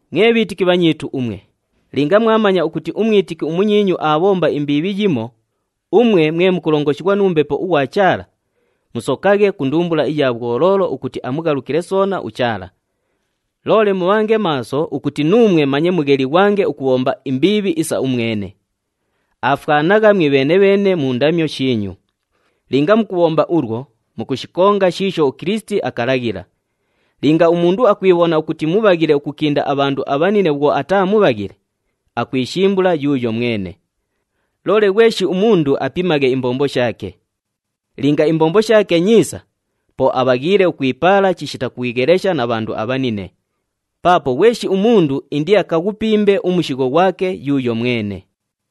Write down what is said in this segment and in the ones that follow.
Mwe bhiitiki bhanyiitu umwe, linga mwamanya ukuti umwitiki umunyiinyu aabhomba imbiibhi yimo, umwe mwe mukulongoshighwa nu Mbepo ughwa Chaala, musokaghe ku ndumbula iya bhwoloolo ukuti amughalukile soona uChaala. Loole mubhange maaso ukuti nuumwe manye mughelighwange ukubhomba imbiibhi isa umwene. Aafwanagha mwibheene-bheene mu ndamyo shiinyu. Linga mukubhomba ulwo, mukushikonga shiisho uKilisiti akalaghila. Linga umundu akwibhona ukuti mubhaghile ukukinda abhandu abhanine bhwo ataa mubhaghile, akwishimbula yuuyo mwene. Loole ghweshi umundu apimaghe imbombo shaake. Linga imbombo shaake nyiisa, po abhaghiile ukwipaala chishita kwighelesha na bhandu abhanine. Paapo ghweshi umundu indiakaghupimbe umushigho ghwake yuuyo mwene.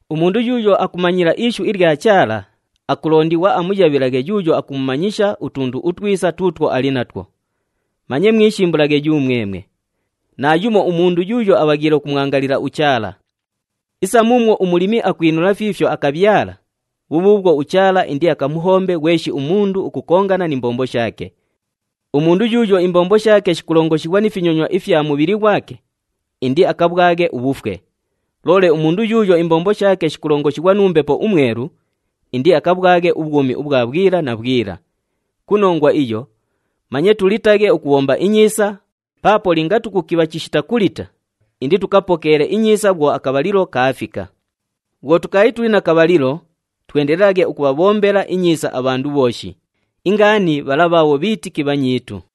Umundu yuuyo akumanyila ishu ilya Chaala, akulondighwa amuyabhilaghe yuuyo akumumanyisha utundu utwisa tuutwo ali natwo. Manye mwishimbulaghe yumwemwe. Naayumo umundu yuuyo abhaghiile ukumwangalila uChaala. Isa muumwo umulimi akwinula fiifyo akabhyala, bhubhuubhwo uChaala indiakamuhombe ghweshi umundu ukukongana ni mbombo shaake. Umundu yuuyo imbombo shaake shikulongoshighwa ni finyonywa ifya mubhili ghwake, indiakabhwaghe ubhufwe. Loole umundu yuuyo imbombo shaake shikulongoshighwa nu Mbepo uMwelu, indiakabhwaghe ubhwumi ubhwa bhwila na bhwila. Ku nongwa iyo, manye tulitaghe ukubhomba inyiisa paapo linga tukukibha chishita kulita, inditukapokeele inyiisa bhwo akabhalilo kaafika. Bhwo tukaali tuli na kabhalilo, twendelelaghe ukubhabhombela inyiisa abhandu bhooshi, ingaani bhala bhaabho bhiitiki bhanyiitu.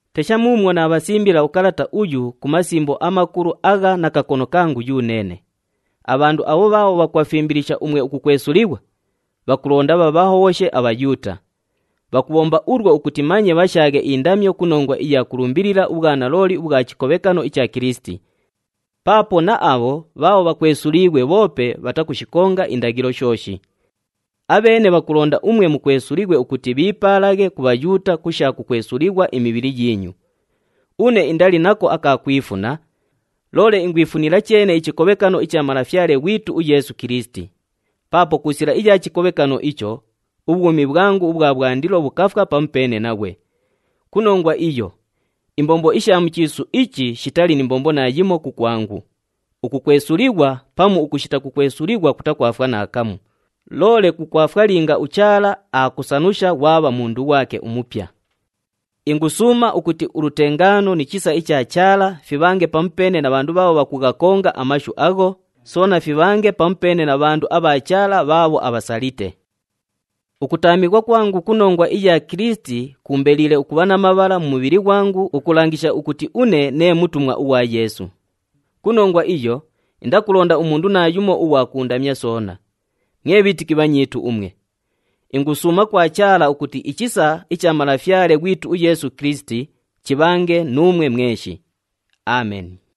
Tesha muumwo naabhasimbila ukalata uyu ku masimbo amakulu agha na kakono kangu yuneene. Abhandu abho bhaabho bhakubhafimbilisha umwe ukukwesulighwa, bhakulonda bhabhahobhoshe aBhayuuta. Bhakubhomba ulwo ukuti manye bhashaaghe indamyo ku nongwa iya kulumbilila ubhwanalooli ubhwa chikobhekano icha Kilisiti. Paapo na abho bhaabho bhakwesuliighwe bhoope bhatakushikonga indaghilo shooshi. Abheene bhakulonda umwe mukwesulighwe ukuti bhiipaalaghe ku Bhayuuta ku sha kukwesulighwa imibhili yiinyu. Une indali nako aka kwifuna, loole ingwifunila cheene ichikobhekano icha Malafyale ghwitu uYeesu Kilisiti. Paapo ku sila iya chikobhekano icho, ubhwumi bhwangu ubhwa bhwandilo bhukafwa pamupeene naghwe. Ku nongwa iyo, imbombo isha mu chiisu ichi shitali ni mbombo naayimo kukwangu. Ukukwesulighwa pamu ukushita kukwesulighwa kutakwafwa naakamu, loole kukwafwa linga uChaala aakusanusha ghwabha mundu ghwake umupya. Ingusuuma ukuti ulutengaano ni chisa icha Chaala, fibhange pamupeene na bhandu bhaabho bhakughakonga amashu agho, soona fibhange pamupeene na bhandu abha Chaala bhaabho abhasalite. Ukutaamighwa kwangu ku nongwa iya Kilisiti kuumbeliile ukubha na mabhala mu mubhili ghwangu ukulangisha ukuti une nee mutumwa ughwa Yeesu. Ku nongwa iyo, indakulonda umundu naayumo ughwa kuundamya soona. Mwe bhiitiki bhanyiitu umwe, ingusuuma kwa Chaala ukuti ichisa icha Malafyale ghwitu uYeesu Kilisiti chibhange nuumwe mweshi. Ameni.